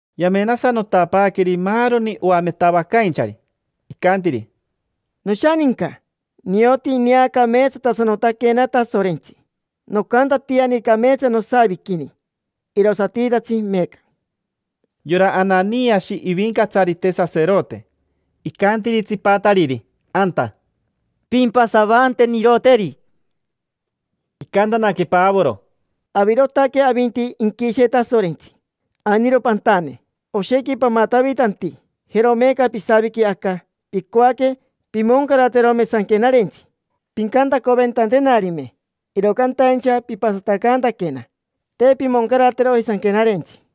Yamenasanotapaaqueri maaroni oametavacainchari. Icantiri: —Noshaninca. Nioti ineacameetsatasanotaquena Tasorentsi. Nocantatiani cameetsa nosaviquini, irosatitatsi meeca. Yora Ananiashi ivincatsarite saserote, icantiri tsipatariri anta: —Pimpasavanteniroteri. Icantanaque Pavoro: —Avirotaque avinti inquishe Tasorentsi; ainiro pantane: oshequi pamatavitanti. Jero meeca pisaviqui aca, picoaque pimoncaraterome Sanquenarentsi, pincantacoventantenarime. Iro cantaincha pipasatacantaquena, te pimoncarateroji Sanquenarentsi.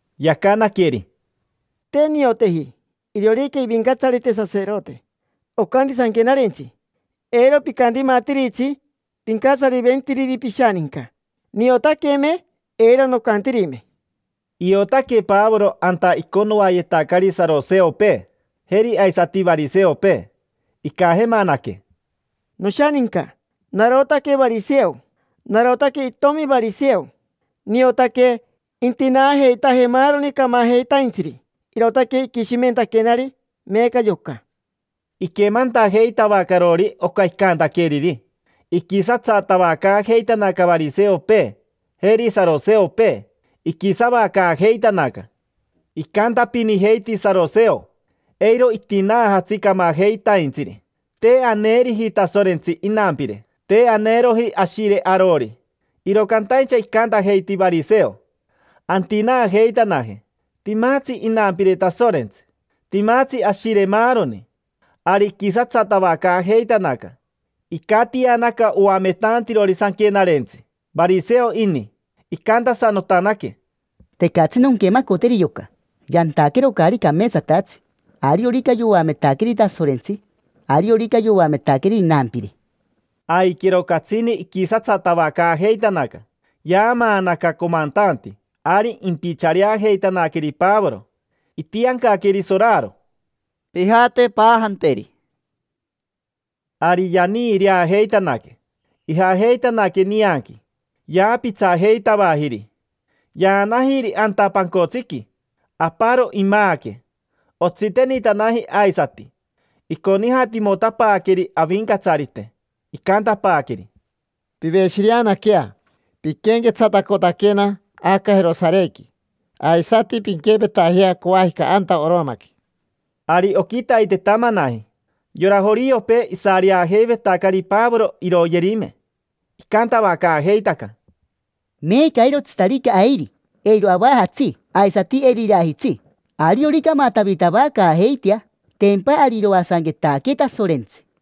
Yacanaqueri: —Te nioteji iriorica ivincatsarite saserote. Ocanti Sanquenarentsi: “Eiro picantimatiritsi pincatsariventiriri pishaninca”. Niotaqueme, eiro nocantirime. Iotaque Pavoro anta iconoayetacari saroseopee, jeri aisati variseopee. Icajemanaque: —Noshaninca. Narotaque variseo. Narotaque itomi variseo. Niotaque intinaajeitaje maaroni camajeitaintsiri, irootaque iquishimentaquenari meeca yoca. Iquemantajeitavacarori oca icantaqueriri, iquisatsatavacaajeitanaca variseopee jeri saroseopee. Iquisavacaajeitanaca. Icantapinijeiti saroseo: “Eiro itinaajatsi camajeitaintsiri. Te aneriji Tasorentsi inampire. Te aneroji ashire arori”. Iro cantaincha icantajeiti variseo: “Antinaajeitanaje. Timatsi inampire Tasorentsi. Timatsi ashire maaroni”. Ari iquisatsatavacaajeitanaca. Icatianaca oametantirori sanquenarentsi, variseo ini. Icantasanotanaque: —Tecatsi nonquemacoteri yoca, yantaquero caari cameetsatatsi. Ariorica yoametaqueri Tasorentsi. Ariorica yoametaqueri inampire. Aiquero catsini iquisatsatavacaajeitanaca. Yaamaanaca comantanti ari impichareajeitanaqueri Pavoro. Itiancaqueri soraro: —Pijate, paajanteri. Ari yaniireajeitanaque, ijajeitanaque nianqui, yaapitsajeitavajiri. Yaanajiri anta pancotsiqui. Aparo imaaque, otsitenitanaji aisati, iconijatimotapaaqueri Avincatsarite. Icantapaaqueri: —Piveshireanaquea. Piquenquetsatacotaquena aca Jerosarequi, aisati pinquempetajea coajica anta Oromaqui. Ari oquitaitetamanaji, yora joriopee, isareajeivetacari Pavoro iroyerime. Icantavacaajeitaca: —Meeca, eirotsitarica airi, eiro avajatsi, aisati eiro irajitsi. Ariorica amatavitavacaajeitea, tempa ari iroasanquetaquee Tasorentsi.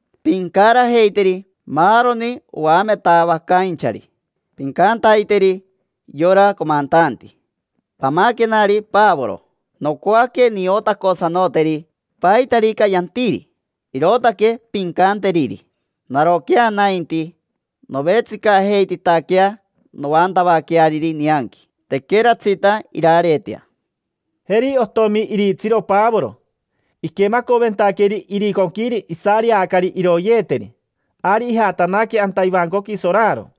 Pincarajeiteri maaroni oametavacainchari, pincantaiteri yora comantanti: “Pamaquenari Pavoro, nocoaque niotacotasanoteri, paitarica yantiri”. Irootaque pincanteriri. Naroquea nainti, novetsicajeititaquea noantavaqueariri nianqui, tequeratsita irareetea. Jeri otomi iritsiro Pavoro, iquemacoventaqueri iriconquiri isareacari iroyeeteri. Ari ijatanaque anta ivancoqui soraro,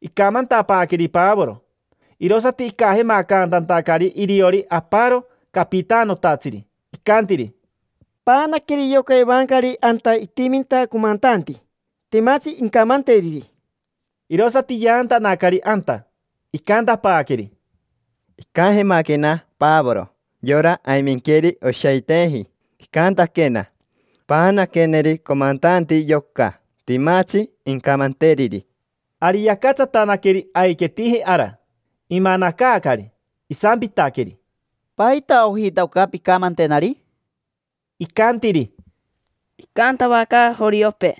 icamantapaaqueri Pavoro. Irosati icajemacantantacari iriori aparo capitanotatsiri, icantiri: —Paanaqueri yoca evancari anta itiminta comantanti. Timatsi incamanteriri. Irosati yaantanacari anta. Icantapaaqueri: —Icajemaquena Pavoro, yora aiminqueiri oshaiteji. Icantaquena: “Paanaqueneri comantanti yoca. Timatsi incamanteriri”. Ari yacatsatanaqueri aiquetiji ara. Imanacaacari, isampitaqueri: —¿Paita ojita oca pincamantenari? Icantiri: —Icantavacaaca joriopee,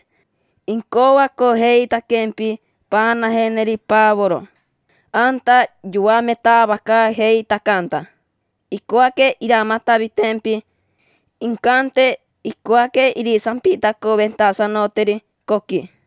incoacojeitaquempi paanajeneri Pavoro anta yoametavacaajeitacanta. Icoaque iramatavitempi, incante icoaque irisampitacoventasanoteri coqui.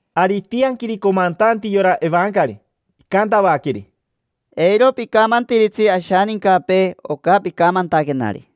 Ari itianquiri comantanti yora evancari. Icantavaqueri: —Eiro picamantiritsi ashanincapee oca picamantaquenari.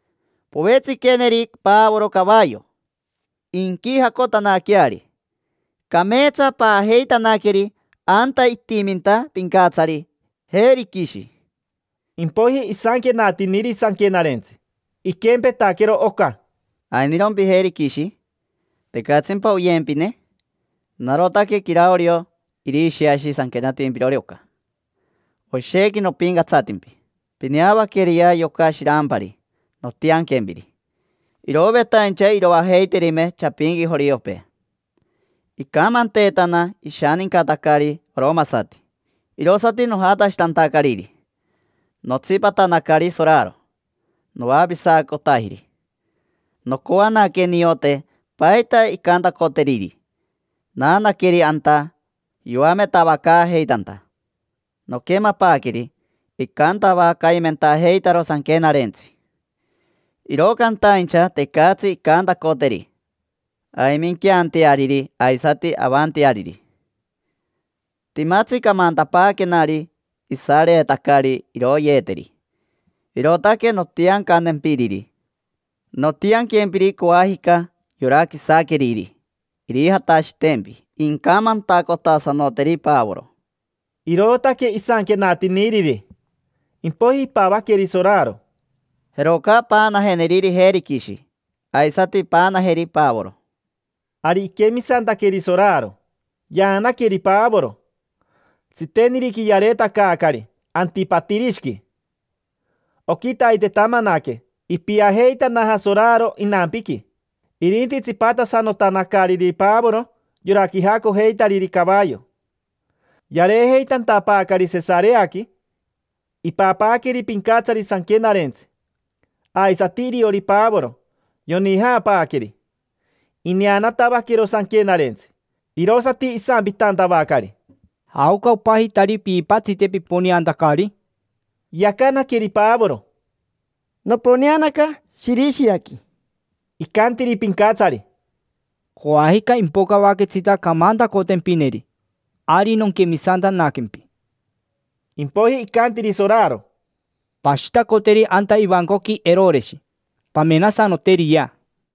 Povetsiqueneri Pavoro cavayo, inquijacotanaqueari. Cameetsa paajeitanaqueri anta itiminta pincatsari Virishi. Impoiji isanquenatiniri sanquenarentsi, iquempetaquero oca: “¿Ainirompi Virishi? ¿Tecatsimpa oyempine? Narotaque Caraorio Irishiashi sanquenatimpirori oca. Oshequi nopincatsatimpi. Pineavaqueriya yoca shirampari nontianquempiri. Irovetaincha iroajeiterime chapinqui joriopee. Icamanteetana ishanincatacari oromasati, irosati nojatashitantacariri, notsipatanacari soraro, noavisacotajiri. Nocoanaque niote paita incantacoteriri, naanaqueri anta yoametavacaajeitanta. Noquemapaaqueri, icantavacaimentajeitaro sanquenarentsi. Iro cantaincha tecatsi incantacoteri aiminqueanteariri aisati avanteariri. Timatsi camantapaaquenari isareetacari iroyeeteri, irootaque nontiancantempiriri. Nontianquempiri coajica yora quisaqueriri irijatashitempi incamantacotasanoteri Pavoro”. Irootaque isanquenatiniriri, impoiji ipavaqueri soraro: —Jeroca paanajeneri Virishi, aisati paanajeri Pavoro. Ari iquemisantaqueri soraro, yaanaqueri Pavoro. Tsiteniriqui yareetacaacari Antipatirishiqui. Oquitaitetamanaque ipiajeitanaja soraro inampiqui. Irinti tsipatasanotanacariri Pavoro yora quijacojeitariri cavayo. Yareejeitantapaacari Sesareaqui, ipapaaqueri pincatsari sanquenarentsi. Aisati iriori Pavoro, yonijaapaaqueri. Ineanatavaquero sanquenarentsi, irosati isampitantavacari: —¿Jaoca opajitari piipatsite piponeantacari? Yacanaqueri Pavoro: —Noponeanaca Shirishiaqui. Icantiri pincatsari: —Coajica impocavaquetsita camantacotempineri, ari nonquemisantanaquempi. Impoiji icantiri soraro: —Pashitacoteri anta ivancoqui Eroreshi, pamenasanoteriyea.